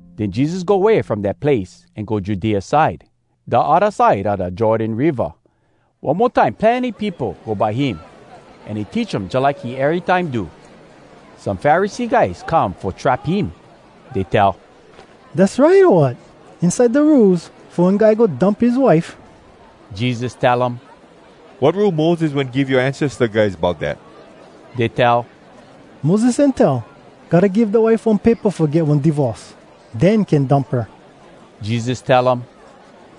Den Jesus go way from dat place an go Judea side, da odda side a da Jordan Riva. One mo time plenny peopo go by him, an he teach um jalike he erytime do. Some Pharisee guys come fo trap him. Dey tell, “Dass right, o wat, inside da Rules, fo one guy go dump his wife?” Jesus tell um, “Wat Rule Moses wen give yoa ancesta guys bout dat?” Dey tell, “Moses wen tell, ‘Gotta give da wife one paypa fo get one divorce, den can dump her.’” Jesus tell um,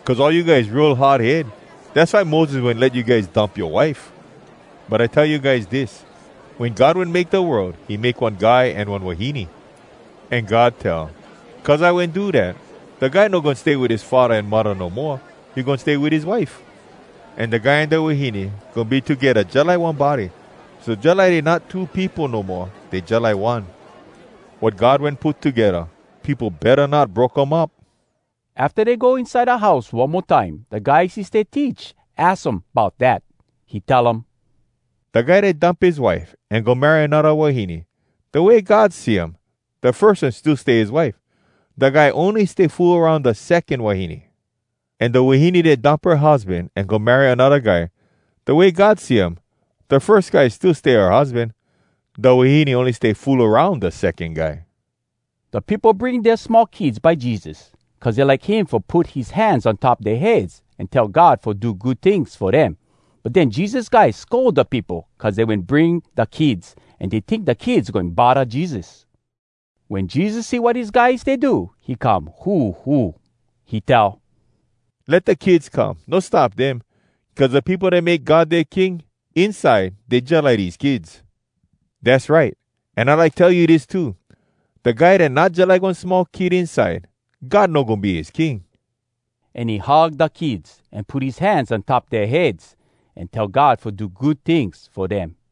“Cuz all you guys real hard head, dass why Moses wen let you guys dump yoa wife. But I tell you guys dis: Wen God wen make da world, he make one guy an one wahine. An God tell, ‘Cuz I wen do dat, da guy no goin stay wit his faddah an muddah no moa, he goin stay wit his wife. An da guy an da wahine goin be togedda jalike one body.’ So jalike dey not two peopo no moa, dey jalike one. Wat God wen put togedda, peopo betta not broke um up.” Afta dey go inside da house one mo time, da guys he stay teach aks um bout dat. He tell um, “Da guy dat dump his wife an go marry anodda wahine, da way God see um, da firs one still stay his wife. Da guy ony stay fool aroun da secon wahine. An da wahine dat dump her husban an go marry anodda guy, da way God see um, da firs guy still stay her husban. Da wahine ony stay fool aroun da secon guy.” Da peopo bring dea small kids by Jesus, cuz dey like him fo put his hands on top dea heads an tell God fo do good tings fo dem. But den Jesus guys scold da peopo cuz dey wen bring da kids, an dey tink da kids goin bodda Jesus. Wen Jesus see wat his guys stay do, he come huhu. He tell, “Let da kids come! No stop dem! Cuz da peopo dat make God dea King, inside dey jalike dese kids. Dass right! An I like tell you dis too: Da guy dat not jalike one small kid inside, God no goin be his King.” An he hug da kids, an put his hands on top dea heads, an tell God fo do good tings fo dem.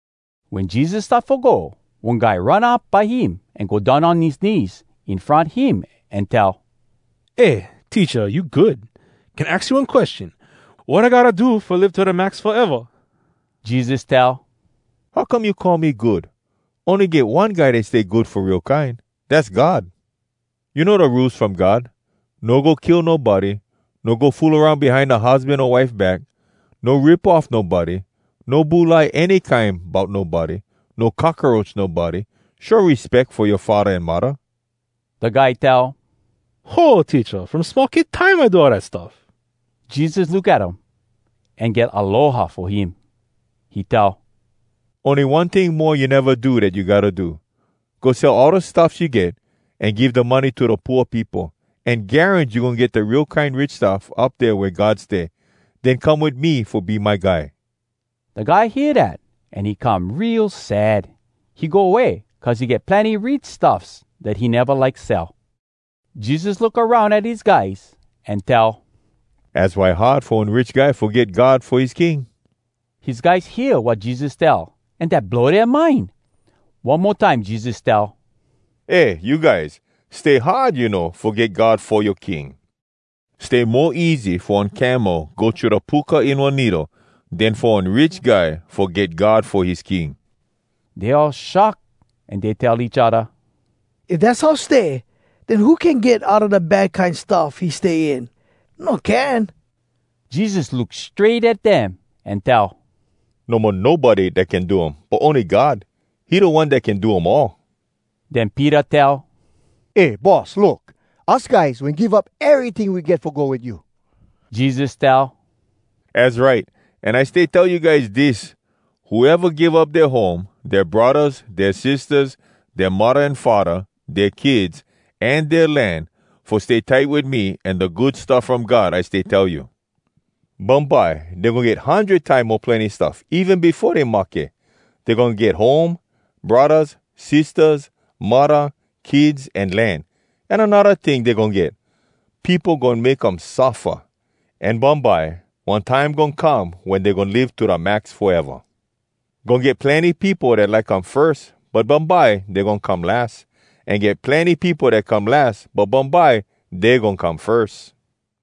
Wen Jesus start fo go, one guy run up by him, an go down on his knees in front him, an tell: “Eh, Teacha, you good. Can aks you one question? Wat I gotta do fo live to da max foeva?” Jesus tell: “How come you call me good? Ony get one guy dat stay good fo real kine, dass God. You know da Rules From God: No go kill nobody, no go fool aroun behind da husban o wife back, no rip off nobody, no bulai any kine bout nobody, no cockaroach nobody, show respeck fo yoa faddah an muddah.” Da guy tell: “Ho, Teacha! From small kid time I do all dat stuff.” Jesus look at um, an get aloha fo him. He tell: “Ony one ting mo you neva do dat you gotta do. Go sell all da stuffs you get, an give da money to da pooa peopo. An garans you goin get da real kine rich stuff up dea wea God stay. Den come wit me fo be my guy.” Da guy hear dat, an he come real sad. He go way, cuz he get plenny rich stuffs dat he neva like sell. Jesus look aroun at his guys an tell, “Az why hard fo one rich guy fo get God fo his king!” His guys hear wat Jesus tell, an dat blow dea mind. One mo time Jesus tell, “Eh you guys! Stay hard, you know, fo get God fo yoa king. Stay mo easy fo one camel go thru da puka in one needle, den fo one rich guy fo get God fo his king.” Dey all shock, an dey tell each odda, “If dass how stay, den who can get outa da bad kine stuff he stay in? No can!” Jesus look strait at dem an tell, “No mo nobody dat can do um, but ony God, he da One dat can do um all.” Den Peter tell, “Eh, Boss, look! Us guys wen give up eryting we get fo go wit you.” Jesus tell, “Az right! An I stay tell you guys dis: Whoeva give up dea home, dea braddahs, dea sistahs, dea muddah an faddah, dea kids, an dea land, fo stay tight wit me an da Good Stuff From God I stay tell you, bumbye dey goin get hundred time mo plenny stuff even befo dey mahke. Dey goin get home, braddahs, sistahs, muddah, kids, an land. An anodda ting dey goin get—peopo goin make um suffa! An bumbye, one time goin come wen dey goin live to da max foeva. Goin get plenny peopo dat like come firs, but bumbye dey goin come las. An get plenny peopo dat come las, but bumbye dey goin come firs.”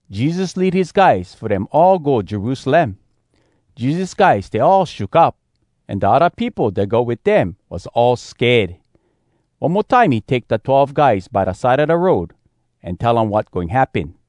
Jesus lead his guys fo dem all go Jerusalem. Jesus guys stay all shook up, an da odda peopo dat go wit dem was all sked. One mo time he take da twelve guys by da side a da road, an tell um wat goin happen.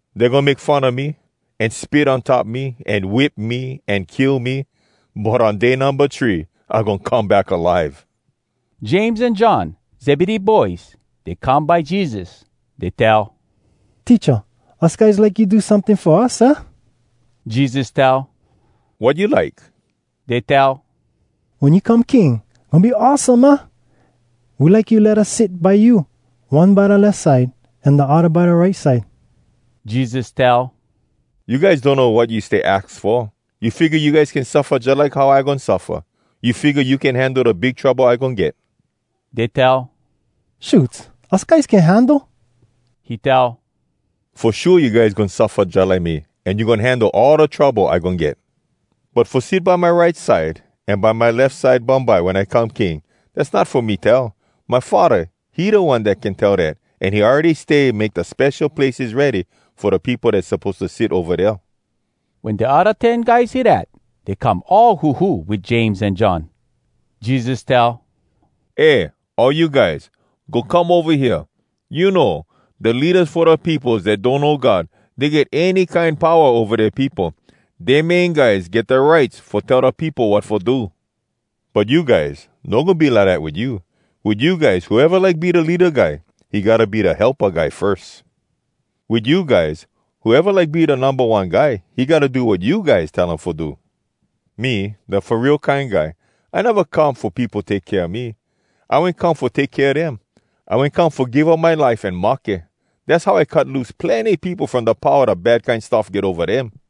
Dey goin make fun a me, an spit on top me, an whip me, an kill me. But on day numba three, I goin come back alive.” James an John, Zebedee boys, dey come by Jesus. Dey tell, “Teacha, us guys like you do someting fo us, aah?” Jesus tell, “Wat you like?” Dey tell, “Wen you come king, goin be awesome, aah? We like you let us sit by you, one by da lef side an da odda by da right side.” Jesus tell, “You guys donno wat you stay aks fo. You figga you guys can suffa jalike how I goin suffa? You figga you can handle da big trouble I goin get?” Dey tell, “Shoots, us guys can handle.” He tell, “Fo shua you guys goin suffa jalike me, an you goin handle all da trouble I goin get. But fo sit by my right side an by my lef side bumbye wen I come King, dass not fo me tell. My Faddah, he da One dat can tell dat, an he awready stay make da spesho places ready fo da peopo dat suppose to sit ova dea.” Wen da odda ten guys hear dat, dey come all huhu wit James an John. Jesus tell, “Eh, all you guys! Go come ova hea! You know, da leadas fo da peopos dat donno God, dey get any kine powa ova dea peopo. Dea main guys get da rights fo tell da peopo wat fo do. But you guys, no goin be lidat wit you. Wit you guys, whoeva like be da leada guy, he gotta be da helpa guy firs. Wit you guys, whoeva like be da numba one guy, he gotta do wat you guys tell him fo do. Me, da Fo Real Kine Guy. I neva come fo peopo take kea me. I wen come fo take kea dem. I wen come fo give up my life an mahke. Dass how I cut loose plenny peopo from da powa da bad kine stuff get ova dem.”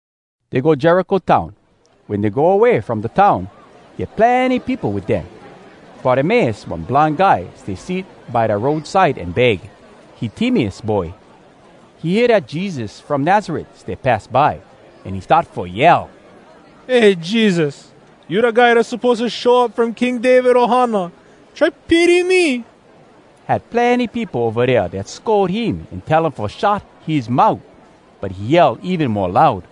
Dey go Jericho town. Wen dey go away from da town, get plenny peopo wit dem. Bartimeus, one blind guy, stay sit by da road side an beg. He Timeus boy. He hear dat Jesus from Nazaret stay pass by, an he start fo yell, “Eh, Jesus! You da guy dat suppose to show up from King David ohana! Try pity me!” Had plenny peopo ova dea dat scold him an tell um fo shut his mout. But he yell even mo loud,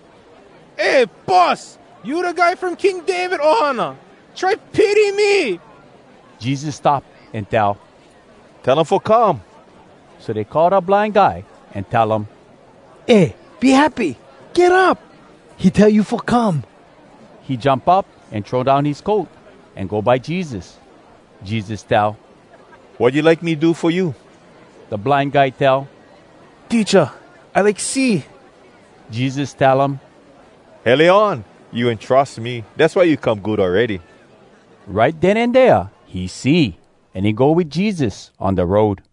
“Eh Boss, you da guy from King David ohana! Try pity me!” Jesus stop an tell, “Tell him fo come!” So dey call da blind guy an tell um, “Eh, be happy! Get up! He tell you fo come.” He jump up an throw down his coat, an go by Jesus. Jesus tell, “Wat you like me do fo you?” Da blind guy tell, “Teacha! I like see!” Jesus tell um, “Hele on! You wen trus me, dass why you come good awready.” Right den an dea he see, an he go wit Jesus on da road.